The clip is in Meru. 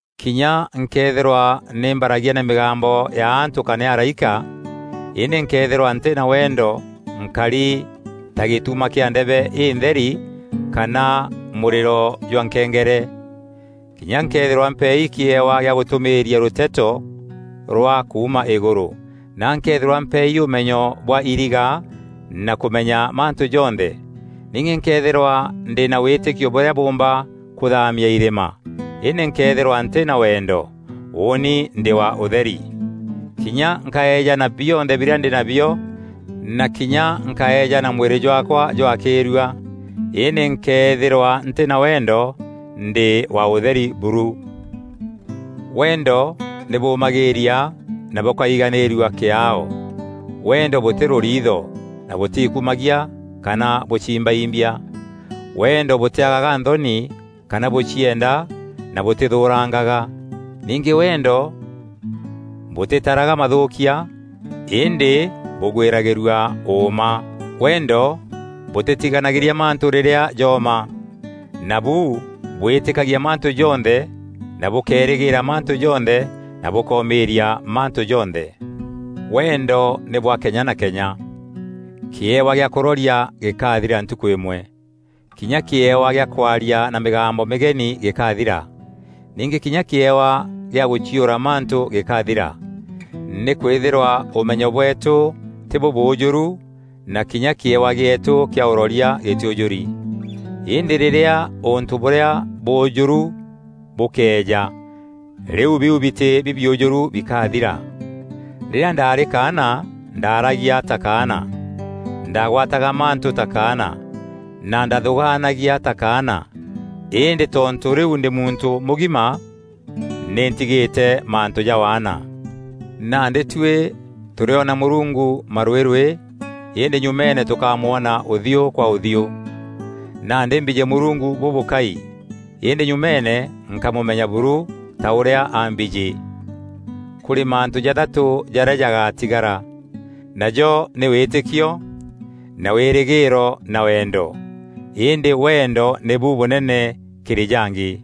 Kinya nkëethîrwa nî mbaragia na mîgambo ya antû kana ya araîka, îndî nkëethîrwa ntî na wendo nkari ta gîtuma kîa ndebe întheri kana mûrîro jwa nkengere. Kinya nkëethîrwa mpeei kîewa gîa gûtûmîîria rûteto rwa kuuma îgûrû na nkëethîrwa mpeei ûmenyo bwa iriga na kûmeenya mantû jonthe, ningî nkëethîrwa ndî na wîtîkio bûrîa bûûmba kûthaamia irîma, îndî nkëethîrwa ntî na wendo, ûûni ndî wa ûtheri. Kinya nkaejana bionthe birîa ndî nabio na kinya nkaeejana mwîrî jwaakwa jwakîîrua, îndî nkëethîrwa ntî na wendo, ndî wa ûtheri buru. Wendo nî bûmagîîria na bûkaîganîîrua kîaao; wendo bûtî rûriitho na bûtiikumagia kana bûcimbaimbia. Wendo bûtîagaga nthoni kana bûcienda na bûtîthûûrangaga. Ningî wendo bûtîtaraga mathûûkia îndî bûgwîragîrua ûûma. Wendo bûtîtiganagîria mantû rîrîa jooma. Nabu bwîtîkagia mantû jonthe na bûkeerîgîîra mantû jonthe na bûkoomîîria mantû jonthe. Wendo nî bwa kenya na kenya. Kîewa gîa kûroria gîkathira ntukû îmwe. Kinya kîewa gîa kwaria na mîgambo mîgeni gîkathira. Ningî kinya kîewa gîa gûciûra mantû gîkathira. Nîkwîthîrwa ûmenyo bweetû tî bûbûûjûru na kinya kîewa gîeetû kîa ûroria gîtîûjûri. Îndî rîrîa ûntû bûrîa bûûjûru bûkeeja, rîu biu bitî bibiûjûru bikathira. Rîrîa ndaarî kaana, ndaaragia ta kaana, ndagwataga mantû ta kaana na ndaathûûganagia ta kaana. Îndî tontû rîu ndî muntû mûgima, nî ntigîte mantû ja waana. Nandî tuî tûrîona Mûrungu marwîrwî îndî nyumeene tûkamwona ûthiû kwa ûthiû. Nandî mbijî Mûrungu bûbûkai îndî nyumeene nkamûmenya buru ta ûrîa ambijî. Kûrî mantû jathatû jarîa jagaatigara. Najo nî wîtîkio na wîrîgîîro na wendo. Îndî wendo nîbu bûnene kîrî jangî.